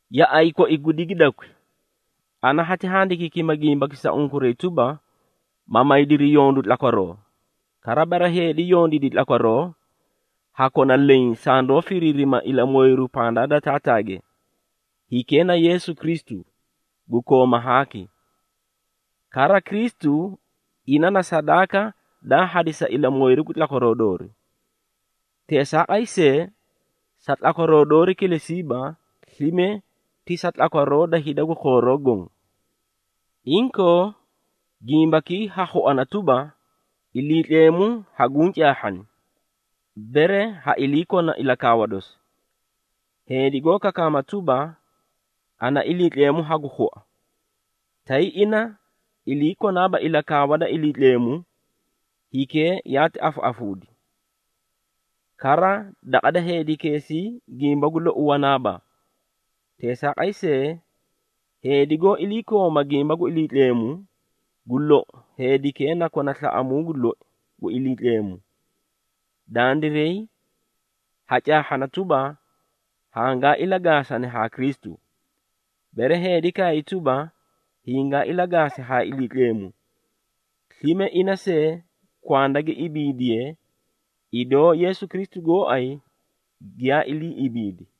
Yaꞌay koi gu digidakwi, ana hati handikiikima gimbaki sa unkuray tuba, ma maydiri yondu tlakwaroo. Kara, bere heedi yondiidi tlakwaroo, ha kona leẽ sandoó firiirima ilamooyiru pandaa da Taataage, hikee na Yeesu Kristu, gu koomaa haaki. Kara, Kristu ina na sadaaka daa hadisi sa ilamooyiru gu tlakwaroo doori. Teesaaqay see, sa tlakwaroo doori kilesiiba, slime ti sa tlakwaroo da hida gu khooroo goõ. Inkoo, gimbakii ha khuana tuba, Iliitleemu haguũ caahhani, bere ha iliikona ilakaawa dosi. Heedi goó kakaama tuba, “Ana Iliitleemu hagu khua,” tay ina ilii konaaba ilakaawa da Iliitleemu, hikee yaati afaꞌafuudi, kara daqa heedikeesii gimba gu lou wanaaba. Teesaaqay see, heedi goó iliikooma gimba gu Iliitleemu, gu lou, heedikee na kona slaꞌamuu gu loi gu Iliitleemu. Dandiray ha caahhana tuba, hangaa ilagaasani haa Kristu, bere heedi kaay tuba, hingaa ilagaasi haa Iliitleemu, slime ina see kwanda gi ibiidiye, idoo Yeesu Kristu goóay giyaa ilii ibiidi.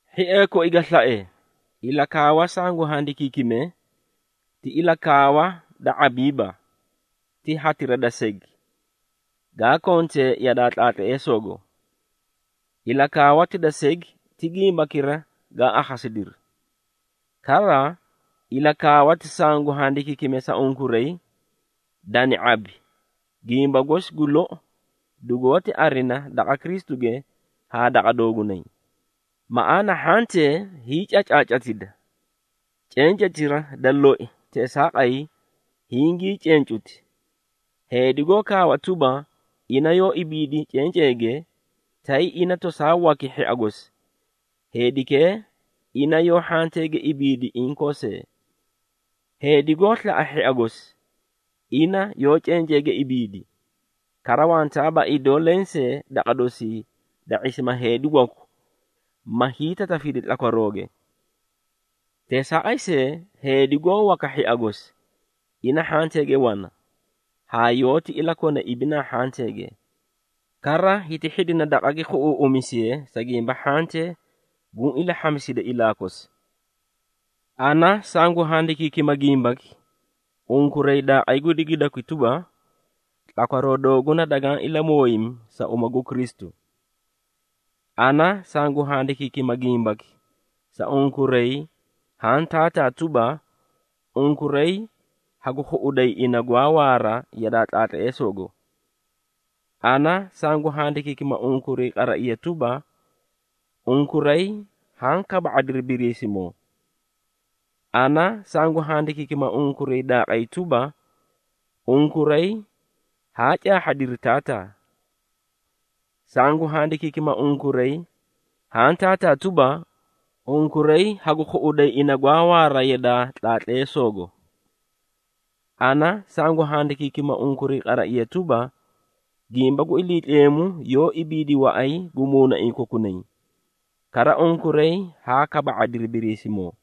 Hhiee koi ga slae, ilakaawa sangu handikiikime, ti ilakaawa da ⁄abiiba, ti hatira da segi, gaa kontee yadaa tlaatleesoogo. Ilakaawati da segi ti gimbakira gaa akhasidiri. Kara, ilakaawati sangu handikiikime sa unkuray, dani ⁄abi, gimba gosi gu lou dugoóti arina daqa Kristuge haa daqa doogunay. Maꞌaana hhantee hiicacaacatida, cencetira da loi teesaaqay hingii cencuti. Heedi goó kaawa tuba ina yoó ibiidi cenceege, tay ina tosaa waki hhia gosi, heedikee ina yoó hhanteege ibiidi inkoo see. Heedi goó slaꞌa hhia gosi, ina yoó cenceege ibiidi, kara wantaaba idoo lensee daqa dosii da ⁄isima heedi waku ma hiitatafidi tlakwarooge. Teesaaqay see, heedi goó waka hhia gosi ina hhanteege wana haa yoóti ilakona ibinaa hhanteege. Kara hiti hhidina daqa gi khuꞌuuꞌumisiye, sa gimba hhantee guũ ilahhamisidi ilaa kosi. Ana sangu handikiikima gimbaki unkuray daaqay gu digidakwi tuba, tlakwaroo dooguna dagaã ilamooyimi sa uma gu Kristu. Ana sangu handikiikima gimbaki sa unkuray haã taataa tuba, unkuray hagu khuꞌuday ina gwaa waara yadaa tlaatleesoogo. Ana sangu handikiikima unkuray qaraiya tuba, unkuray haã kaba⁄adiri Biriisimoo. Ana sangu handikiikima unkuray daaqay tuba, unkuray haa caahhadiri Taataa. Sangu handikiikima unkuray haã taataa tuba, unkuray hagu khuꞌuday ina gwaa waara yadaa tlaatleesoogo. Ana sangu handikiikima unkuray qaraiya tuba, gimba gu Iliitleemu yoó ibiidi waꞌay gu muunaiĩ kokunay, kara unkuray haa kaba⁄adiri Biriisimoo.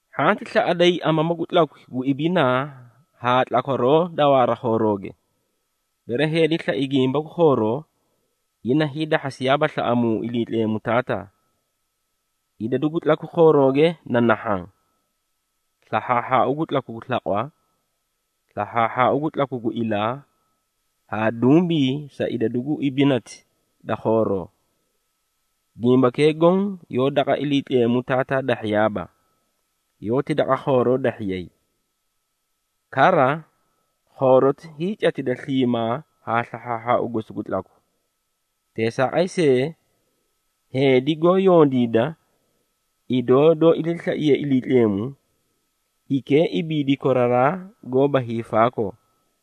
Hhanti slaꞌaday amamu gu tlakwi gu ibinaa haa tlakwaroo da waara khoorooge. Bere heedi slai gimba gu khooroo, ina hiidahhasiyaaba slaꞌamuu Iliitleemu Taataa. Idadu gu tlakwi khoorooge na nahhaã, slahhaahhaau gu tlaku gu slaqwa, slahhaahhaau gu tlaku gu ilaa, haa dumbii sa idadu gu ibinati da khooroo. Gimbakee goõ yoó daqa Iliitleemu Taataa dahhiyaaiiba, yoóti daqa khooroo dahhiyay. Kara, khooroti hiicatida sliimaa haa slahhaahhaau gosi gu tlaku. Teesaaqay see, heedi goó yondiida, idoo doó iliislaiye Iliitleemu, hikee ibiidi koraraa haa koraraa goóba hiifaakoo.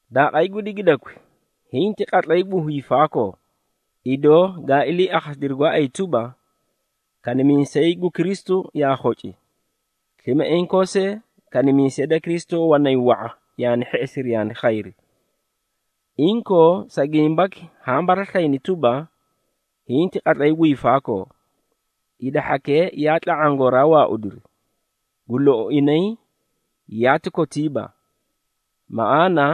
Daaqay gu digidakwi, hinti qatlay gu hiifaakoo! Idoo gaa ilii akhasidiri gooay tuba, kanimiisay gu Kristu yaa khoci. Slime inkoo see, kanimiisee da Kristu wanay wa⁄a yaani hheꞌesiri yaani khayri. Inkoo, sa gimbaki haã baraslayini tuba, hinti qatlay gu hiifaakoo. Hida hhakee yaa tla⁄aã gooraa waaudiri, gu lou inay yaati kotiibaa. Maꞌaana,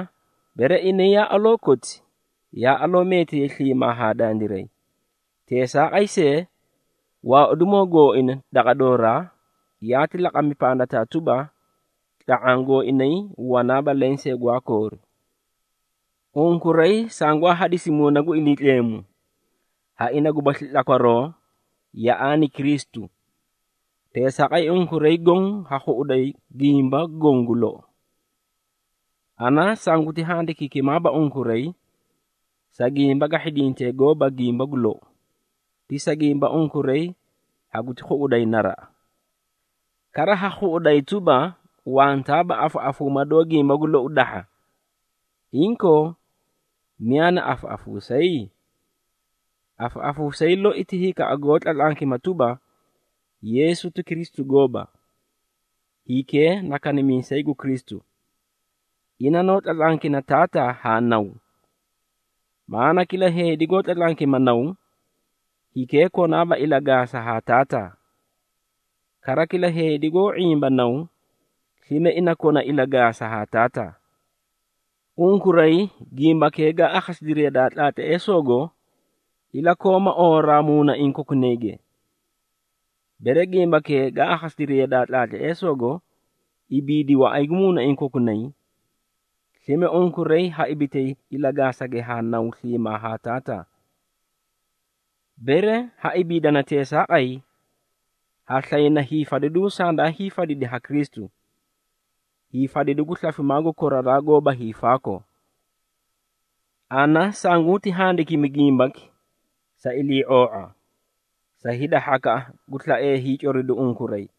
bere inay yaa aloo koti, yaa aloo meetiyay sliimaa haa dandiray. Teesaaqay see, waaudimoo gooina daqa dooraa, yaati laqami pandataa tuba, tla⁄aã gooinay wanaaba lensee gwaa koori. Unkuray sangwaa hadisi Muuna gu Iliitleemu, ha ina gubasli tlakwaroo yaꞌaani Kristu. Teesaaqay unkuray goõ ha khuꞌuday gimba goõ gu lou. Ana sanguti handikiikimaaba unkuray, sa gimba ga hhidintee gooba gimba gu lou, ti sa gimba unkuray haguti khuꞌuday naraꞌa. Kara ha khuꞌuday tuba, wantaaba afaꞌafuuma doó gimba gu lou dahha. Inkoo, miyaa na afaꞌafuusayi? Afaꞌafuusayi loi ti hikaꞌa goó tlatlankima tuba, Yeesu ti Kristu gooba. Hikee na kanimiisay gu Kristu, ina noó tlatlankina Taataa haa Naw. Maꞌaana kila heedi goó tlatlankima Naw, hikee konaaba ilagaasa haa Taataa. Kara kila heedi goó ⁄imba Naw, slime ina kona ilagaasa haa Taataa. Unkuray, gimbakee gaa akhasidiri yadaa tlaatleesoogo, ilakooma oowaraa muunaiĩ kokunayge. Bere gimbakee gaa akhasidiri yadaa tlaatleesoogo ibiidi waꞌay gu muunaiĩ kokunay, slime unkuray ha ibitay ilagaasage haa Naw sliimaa haa Taataa. Bere ha ibiidana teesaaqay, ha slayna hiifadidu sandaa hiifadidi ha Kristu, hiifadidu gu slafimaa gu koraraa haa koraraa goóba hiifaakoo. Ana sanguti handikimi gimbaki, sa ilii⁄oo⁄a, sa hida hhakaꞌa gu slaee hiicoridu unkuray.